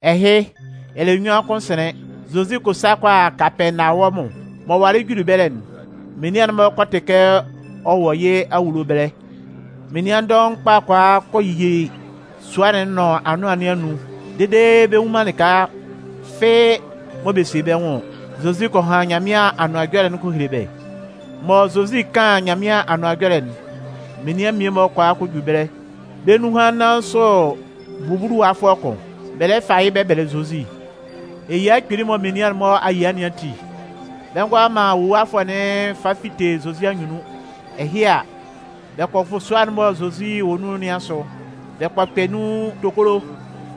Ɛhɩ, ɛlɛ nnyuan kʋn sɩnlɩn, Zozi kɔ sa kɔ a Kapɛɛnawɔmʋn. M'ɔ walɩ juli ɛbɛlɛ'n, menian'n-mɔ kɔ tɩ kɛ ɔ wɔ yɩ́ awulo ɛbɛlɛ. Menian dɔʋn kpa kɔ a kɔ yi sua'n nʋn anʋan nɩn anun dede bɛ nnwun man lɩka fɩ́ɩ́ mɔ bɛ sie bɛ́ nwʋn ɔ. Zozi kɔ han Nyanmɩan Anʋan Ɛjɔlɛ'n kɔ hele bɛ́. Mɔ Zozi 'kan Nyanmɩan Anʋan Ɛjɔlɛ'n, menian mmie-mɔ kɔ a kɔ ju ɛbɛlɛ. Bɛ́ nunhan nnan sʋ bubuluwafʋɛ kʋn, bɛ lɛ fa yɩ́ bɛ bɛlɛ Zozi. Eyia kpili mɔ menian'n-mɔ a yia nɩn ati, bɛ ngʋala man wuluwafʋɛ'n fa fite Zozi anyunnun. Ɛhɩ a, bɛ kɔ fʋ sua'n mɔ Zozi wɔ nun nɩn asʋ, bɛ kɔ kpɛ nun tokolo.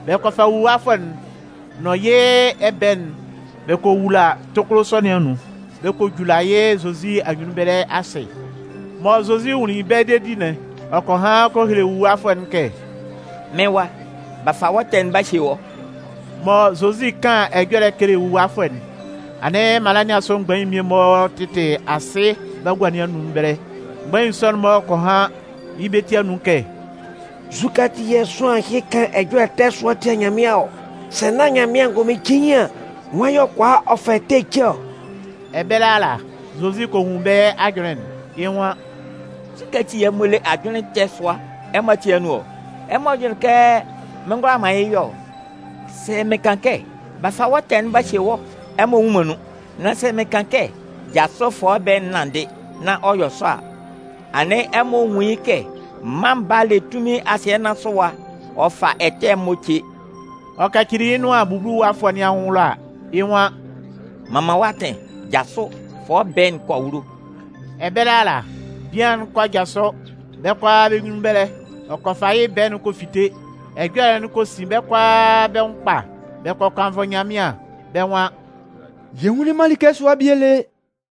Bɛ kɔ fa bubuluwafʋɛ'n nʋn yɩ́ ɛbɛɛ'n bɛ kɔ wula tokolo sɔ nɩn anun bɛ kɔ jula yɩ́ Zozi anyunnun ɛbɛlɛ asɩ. Mɔ Zozi nwunlin bɛ́ dedi'n, ɔ kɔ han kɔ hele bubuluwafʋɛ'n kɛ: “Mɩ́n wa, b'a fa wɔ́ ɛtɛ'n b'a hye wɔ́.” Mɔ Zozi 'kan ɛjɔlɛ'n kele wuluwafʋɛ'n, anɩn mala nɩn asʋ mgbain'n mmie-mɔ tɩtɩ asɩ bagua nɩn anun ɛbɛlɛ. Mgbain sɔ'n-mɔ kɔ han yɩ́ bɛ́ ti anun kɛ: “Nzukɛ ati yɛ̂ sʋanlan ɛhɩ kan ɛjɔlɛ ɛtɛ sʋa tia Nyanmɩan ɔ? Sɛ nán Nyanmɩan angʋnmɩn cein an, nwan yɛ̂ ɔ kʋala ɔ fa ɛtɛ ce ɔ?” Ɛbɛlɛ ala, Zozi kɔ nwun bɛ́ ajʋnlɩn'n. Yɩ́ nwan: “Nzukɛ ati yɛ̂ ɛmɔ le ajʋnlɩn sʋa-mɔ ɛmɔ ati anun ɔ? Ɛmɔ jʋnlɩn kɛ mɩn ngʋala man yɩ́ yɔ ɔ? Sɛ mɩn kan kɛ: ‘B'a fa wɔ́ ɛtɛ'n b'a hye wɔ́,’ ɛmɔ nnwun man nun. Nan sɛ mɩn kan kɛ: ‘Jasʋ fa wɔ́ ɛbɛɛ'n nanndɩ,’ nán ɔ yɔ sɔ a, anɩn ɛmɔ a nwun yɩ́ kɛ Mân Baa'n le tunmin asɩɛ nɩn asʋ ɛwa ɔ fa ɛtɛ'n-mɔ ce.” Ɔ kacili yɩ́ nʋan bubuluwafʋɛ nɩn anwʋn ɛlɔ a, yɩ́ nwan: “M'an man wɔ́ atɩn, jasʋ, fa wɔ́ ɛbɛɛ'n kɔ awulo.” Ɛbɛlɛ ala, bian'n kɔ jasʋ bɛ́ kʋalaa bɛ́ nyunnun ɛbɛlɛ. Ɔ kɔ fa yɩ́ ɛbɛɛ'n ɔ kɔ fite. Ɛjɔlɛ'n kɔ sin bɛ́ kʋalaa bɛ́ nwʋn kpa. Bɛ kɔ kannvʋ Nyanmɩan. Bɛ́ nwan: “Yɛ nwunlin man like sʋa bie lé!”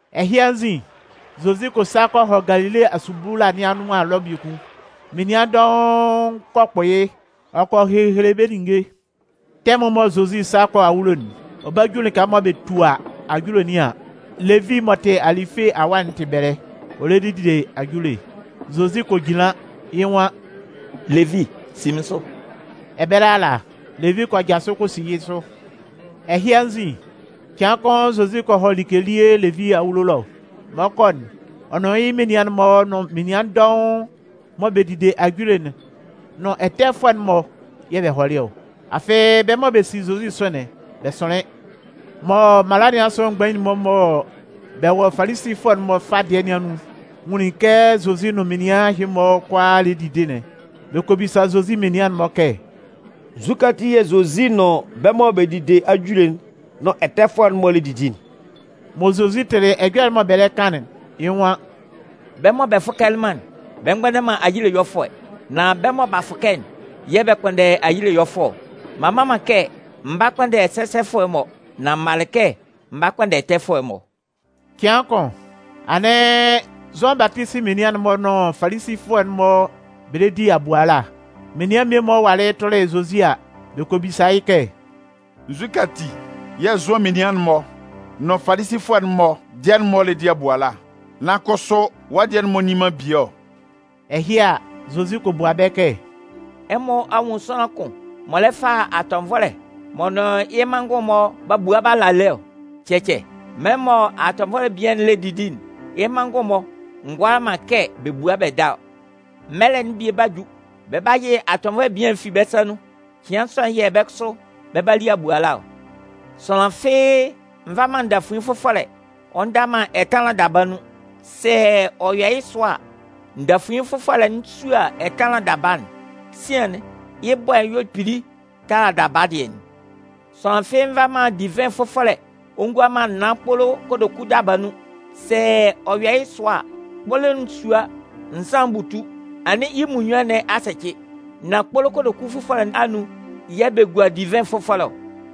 Ɛhɩ anzin, Zozi kɔ sa kɔ hɔ Galile asubula nɩn anʋan ɛlɔ biekun. Menian dɔʋn kɔ kpʋ yɩ́, ɔ kɔ hehele bɛ́ ninnge. Tɛmʋn mɔ Zozi 'sa kɔ awulo'n, ɔ 'ba ju lɩka mɔ bɛ tua ajule nɩn an, Levi m'ɔ tɩ Alɩfe awa'n tɩ ɛbɛlɛ. Ɔ lɛ dide ajule. Zozi kɔ jinlan, yɩ́ nwan: “Levi, si mɩ́n sʋ!” Ɛbɛlɛ ala, Levi kɔ jasʋ kɔ si yɩ́ sʋ. Ɛhɩ anzin, cɩan kʋn Zozi kɔ hɔ like elie Levi awulo ɛlɔ. Mɔ ɔ 'kɔ'n, ɔ nʋn yɩ́ menian'n-mɔ nʋn menian dɔʋn mɔ bɛ dide ajule'n nʋn ɛtɛfʋɛ'n-mɔ yɛ̂ bɛ hɔlɩ ɔ. Afɩ bɛ́ mɔ bɛ si Zozi sʋ'n, bɛ sʋnlɩn. Mɔ mala nɩn asʋ mgbain'n-mɔ mɔ bɛ wɔ Falisifʋɛ'n-mɔ fâ dɩɛ nɩn anun'n nwunlin kɛ Zozi nʋn menian ɛhɩ-mɔ kʋalaa lɛ didi'n, bɛ kɔ bisa Zozi menian'n-mɔ kɛ: “Nzukɛ ati yɛ̂ Zozi nʋn bɛ́ mɔ bɛ dide ajule'n nʋn ɛtɛfʋɛ'n-mɔ lɛ didi'n?” Mɔ Zozi tɩlɩ ɛjɔlɛ'n mɔ bɛ lɛ kan'n, yɩ́ nwan: “Bɛ́ mɔ bɛ fʋkɛlɩ man'n, bɛ mgbʋnndɛ man ayile ɛyɔlɛfʋɛ. Nan bɛ́ mɔ b'a fʋkɛ'n yɛ̂ bɛ kpʋnndɛ ayile ɛyɔlɛfʋɛ ɔ. M'an mma man kɛ m 'ba kpʋnndɛ sɛsɛfʋɛ'n-mɔ. Nan m malɩ kɛ m 'ba kpʋnndɛ ɛtɛfʋɛ'n-mɔ.” Cɩan kʋn, anɩn Zʋan Batisi menian'n-mɔ nʋn Falisifʋɛ'n-mɔ bɛ lɛ di abuala. Menian mmie-mɔ walɩ tʋlɩ Zozi a, bɛ kɔ bisa yɩ́ kɛ: “Nzukɛ ati yɛ̂ Zʋan menian'n-mɔ nʋn Falisifʋɛ'n-mɔ dɩɛ'n-mɔ lɛ di abuala, nan kʋsʋ wɔ́ dɩɛ'n-mɔ nni man bie ɔ?” Ɛhɩ a, Zozi kɔ bua bɛ́ kɛ: “Ɛmɔ a nwun sʋanlan kʋn m'ɔ lɛ fa atɔnvɔlɛ m'ɔ nʋn yɩ́ manngʋn'n-mɔ b'a bua b'a la lé ɔ? Cɛcɛ, mɛlɛ mɔ atɔnvɔlɛ bian'n lɛ didi'n, yɩ́ manngʋn'n-mɔ ngʋala man kɛ bɛ bua bɛ da ɔ. Mɛlɛ'n bie 'ba ju, bɛ 'ba yɩ atɔnvɔlɛ bian'n fi bɛ́ sa nun. Cɩan sɔ'n yɛ̂ bɛ́ kʋsʋ bɛ 'ba li abuala ɔ. Sʋanlan fɩ́ɩ́ nva man ndafuin fʋfɔlɛ ɔ nda man ɛtanlan daba nun. Sɛ ɔ yɔ yɩ́ sɔ a, ndafuin fʋfɔlɛ'n 'sua ɛtanlan daba'n. Sian'n, yɩ́ bɔɛ'n 'yɔ kpili tala daba dɩɛ'n. Sʋanlan fɩ́ɩ́ nva man divɩn fʋfɔlɛ ɔ ngua man naan kpolo kotoku daba nun. Sɛ ɔ yɔ yɩ́ sɔ a, kpolo'n 'sua nzan'n butu, anɩn yɩ́ munnyuan nɩn a sɛcɩ. Nan kpolo kotoku fʋfɔlɛ anun yɛ̂ bɛ gua divɩn fʋfɔlɛ ɔ.”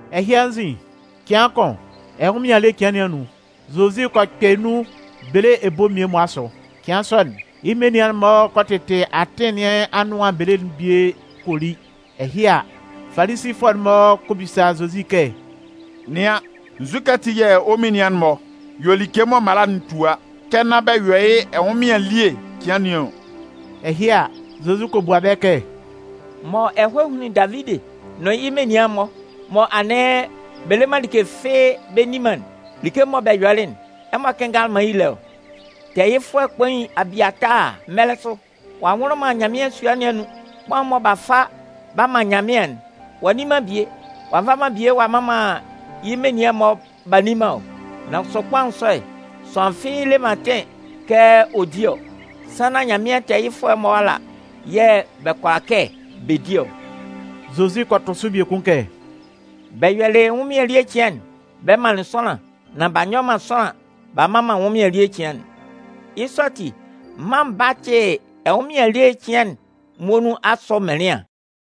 Ɛhɩ anzin, cɩan kʋn, ɛnwʋnmɩan ele cɩan nɩn anun, Zozi kɔ kpɛ nun bele ebo mmie-mɔ asʋ. Cɩan sɔ'n, yɩ́ menian'n-mɔ kɔ tɩtɩ atɩn nɩn anʋan bele'n bie kɔ li. Ɛhɩ a, Falisifʋɛ'n-mɔ kɔ bisa Zozi kɛ: “Nɩan, nzukɛ ati yɛ̂ wɔ́ menian'n-mɔ yɔ like mɔ mala'n tua kɛ nán bɛ yɔ yɩ́ ɛnwʋnmɩan ele cɩan nɩn ɔ?” Ɛhɩ a, Zozi kɔ bua bɛ́ kɛ: “Mɔ ɛhɔɛ hunlin Davidi nʋn yɩ́ menian'n-mɔ, mɔ anɩn bɛ le man like fɩ́ɩ́ bɛ nni man'n, like mɔ bɛ yɔlɩ'n, ɛmɔ kɩnngalɩ man yɩ́ le ɔ? Tɛɛyɩfʋɛ kpain Abiataa mɛlɛ sʋ, ɔ'a nwʋlʋ man Nyanmɩan sua nɩn anun, kpaʋn'n mɔ b'a fa b'a man Nyanmɩan'n, ɔ a nni man bie, ɔ'a nva bie ɔ'a man yɩ́ menian'n-mɔ b'a nni man ɔ? Nan kʋsʋ kpaʋn sɔ'n, sʋanlan fɩ́ɩ́ le man atɩn kɛ ɔ di ɔ, sannan Nyanmɩan tɛɛyɩfʋɛ'n-mɔ ala yɛ̂ bɛ kʋala kɛ bɛ di ɔ.” Zozi kɔ tʋ sʋ biekun kɛ: “Bɛ yɔlɩ ɛnwʋnmɩan ele cɩan'n bɛ manlɩn sʋanlan, nan b'a nyɔ man sʋanlan b'a mman man ɛnwʋnmɩan ele cɩan'n. Yɩ́ sɔ ati, Mân Baa'n tɩ ɛnwʋnmɩan ele cɩan'n muonun asʋ mɩnlɩan.”